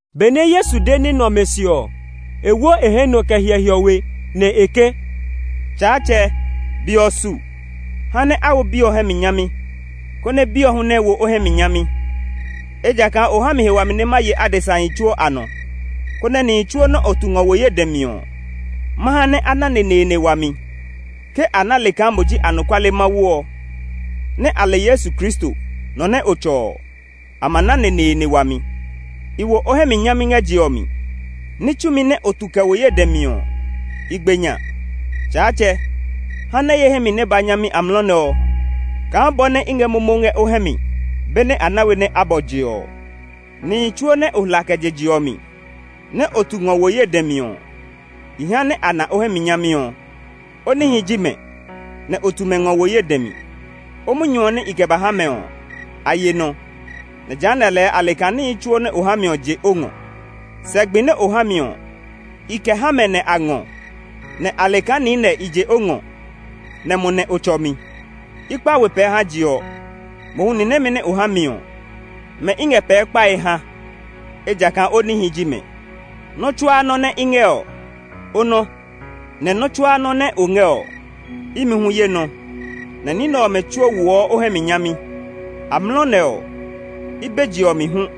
Benɛ Yesu de ní nɛ ɔmɛ se ɔ, e wo hɛ nɔ kɛ hyɛ hiɔwe, nɛ e ke, “Tsaatsɛ, be ɔ su. Ha nɛ a wo o Bi ɔ hɛ mi nyami, konɛ Bi ɔ hu nɛ wo o hɛ mi nyami. Ejakaa o ha mi he wami nɛ ma ye adesahi tsuo a nɔ, konɛ nihi tsuo nɛ o tu ngɔ wo ye dɛ mi ɔ, ma ha nɛ a na neneene wami. Ke a na le kaa mo ji anɔkuale Mawu ɔ, nɛ a le Yesu Kristo, nɔ nɛ o tsɔ ɔ, a ma na neneene wami. I wo o hɛ mi nyami ngɛ je ɔ mi; ní tsumi nɛ o tu kɛ wo ye dɛ mi ɔ, i gbe nya. Tsaatsɛ, ha nɛ ye hɛ mi nɛ ba nyami amlɔ nɛ ɔ kaa bɔ nɛ i ngɛ momo ngɛ o hɛ mi benɛ a na we nɛ a bɔ je ɔ. “Nihi tsuo nɛ o hla kɛ je je ɔ mi nɛ o tu ngɔ wo ye dɛ mi ɔ, i ha nɛ a na o hɛ mi nyami ɔ. O nihi ji mɛ, nɛ o tu mɛ ngɔ wo ye dɛ mi. O munyu ɔ nɛ i kɛ ba ha mɛ ɔ, a ye nɔ. Nɛ jehanɛ lɛɛ a le kaa níhi tsuo nɛ o ha mi ɔ je o ngɔ. Sɛ gbi nɛ o ha mi ɔ, i kɛ ha mɛ nɛ a ngɔ, nɛ a le kaa niinɛ i je o ngɔ, nɛ mo nɛ o tsɔ mi. “I kpa we pɛɛ ha je ɔ; mohu ni nɛmɛ nɛ o ha mi ɔ, mɛ i ngɛ pɛɛ kpae ha; ejakaa o nihi ji mɛ. Nɔ́ tsuaa nɔ́ nɛ i ngɛ ɔ, o nɔ, nɛ nɔ́ tsuaa nɔ́ nɛ o ngɛ ɔ, imi hu ye nɔ; nɛ ní nɛ ɔmɛ tsuo woɔ o hɛ mi nyami. Amlɔ nɛ ɔ, i be je ɔ mi hu.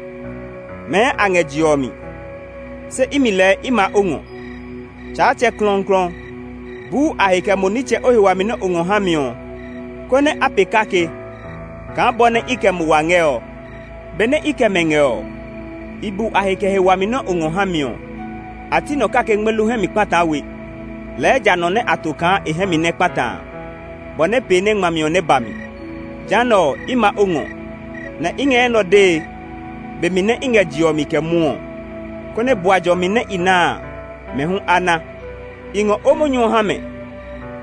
Mɛɛ a ngɛ je ɔ mi, se imi lɛɛ i ma o ngɔ. Tsaatsɛ klɔuklɔu! Bu a he kɛ mo nitsɛ o he wami nɛ o ngɔ ha mi ɔ, konɛ a pee kake kaa bɔ nɛ i kɛ mo wa ngɛ ɔ. Benɛ i kɛ mɛ ngɛ ɔ, i bu a he kɛ he wami nɛ o ngɔ ha mi ɔ. A ti nɔ kake ngmelu hɛ mi kpataa we, lɛɛ ja nɔ nɛ a to kaa e hɛ mi nɛ kpata a, bɔ nɛ pee nɛ ngmami ɔ nɛ ba mi. Jehanɛ ɔ, i ma o ngɔ, nɛ i ngɛ enɛ ɔ dee be mi nɛ i ngɛ je ɔ mi kɛ mwɔɔ, konɛ bua jɔmi nɛ i na a, mɛ hu a na. I ngɔ o munyu ɔ ha mɛ;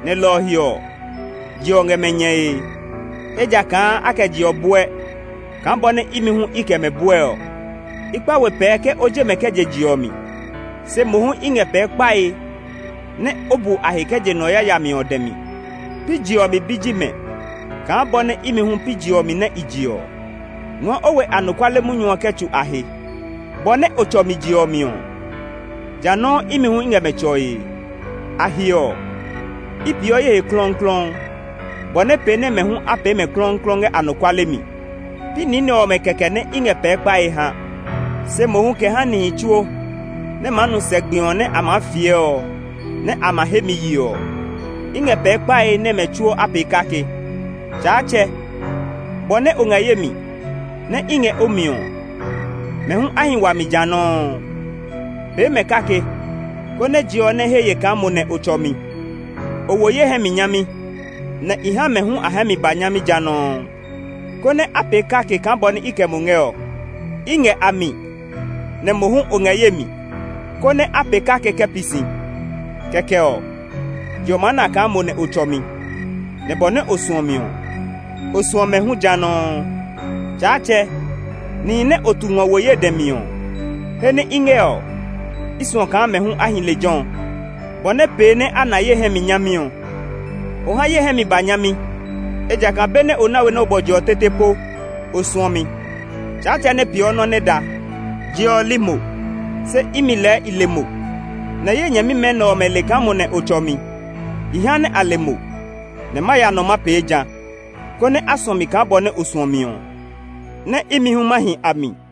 nɛ lɔ ɔ he ɔ, je ɔ ngɛ mɛ nyɛe. Ejakaa a kɛ je ɔ bɔɛ, kaa bɔ nɛ imi hu i kɛ mɛ bɔɛ ɔ. I kpa we pɛɛ ke o je mɛ kɛ je je ɔ mi; se mohu i ngɛ pɛɛ kpae nɛ o bu a he kɛ je nɔ yayami ɔ dɛ mi. Pi je ɔ mi bi ji mɛ kaa bɔ nɛ imi hu pi je ɔ mi nɛ i je ɔ. Ngɔɔ o we anɔkuale munyu ɔ kɛ tsu a he. Bɔ nɛ o tsɔ mi je ɔ mi ɔ, ja nɔuu imi hu i ngɛ mɛ tsɔe. A he ɔ, i peeɔ ye he klɔuklɔu, bɔ nɛ pee nɛ mɛ hu a pee mɛ klɔuklɔu ngɛ anɔkuale mi. “Pi ni nɛ ɔmɛ kɛkɛ nɛ i ngɛ pɛɛ kpae ha, se mohu kɛ ha nihi tsuo nɛ maa nu sɛ gbi ɔ nɛ a maa fiɛ ɔ nɛ a ma he mi maa ye ɔ. I ngɛ pɛɛ kpae nɛ mɛ tsuo a pee kake. Tsaatsɛ! Bɔ nɛ o ngɛ ye mi, nɛ i ngɛ o mi ɔ, mɛ hu a hi wa mi jã nɔuu. Pee mɛ kake, konɛ je ɔ nɛ he ye kaa mo nɛ o tsɔ mi. O wo ye hɛ mi nyami, nɛ i ha mɛ hu a hɛ mi ba nyami ja nɔuu, konɛ a pee kake kaa bɔ nɛ i kɛ mo ngɛ ɔ. I ngɛ a mi, nɛ mo hu o ngɛ ye mi, konɛ a pee kake kɛ pi si; kɛkɛ ɔ, je ɔ maa na kaa mo nɛ o tsɔ mi; nɛ bɔ nɛ o suɔ mi ɔ, o suɔ mɛ hu ja nɔuu. “Tsaatsɛ! Nihi nɛ o tu ngɔ wo ye dɛ mi ɔ, he nɛ i ngɛ ɔ, i suɔ kaa mɛ hu a hi lejɛ ɔ, bɔ nɛ pee nɛ a na ye hɛ mi nyami ɔ. O ha ye hɛ mi ba nyami, ejakaa benɛ o na we nɛ o bɔ je ɔ tete po o suɔ mi. Tsaatsɛ nɛ peeɔ nɔ́ nɛ da! Je ɔ li mo, se imi lɛɛ i le mo; nɛ ye nyɛmimɛ nɛ ɔmɛ le kaa mo nɛ o tsɔ mi. I ha nɛ a le mo, nɛ ma ya nɔ ma pee jã, konɛ á suɔ mi kaa bɔ nɛ o suɔ mi ɔ, nɛ imi hu ma hi a mi.”